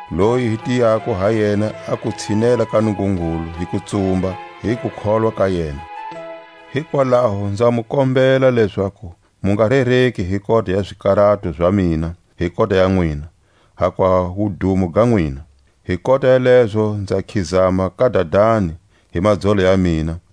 loyi hi tiyako ha yena a ku tshinela ka Nungungulu hi kutsumba, hi kukholwa ka yena. Hikwalaho nza mu kombela lezaku mu nga rereki hi kota ya zikarato za mina hi kota ya nwina, hakuva wudumo ga nwina. Hi kota ya lezo nza khizama ka Dadani hi madzolo ya mina,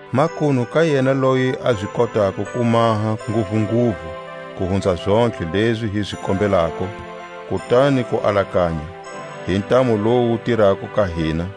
Makunu ka yena loyi a zi kotako ku maha nguvunguvu ku hunza zontlhe lezi hi zi kombelako, kutani ku alakanya, hi ntamu lowu wu tirako ka hina,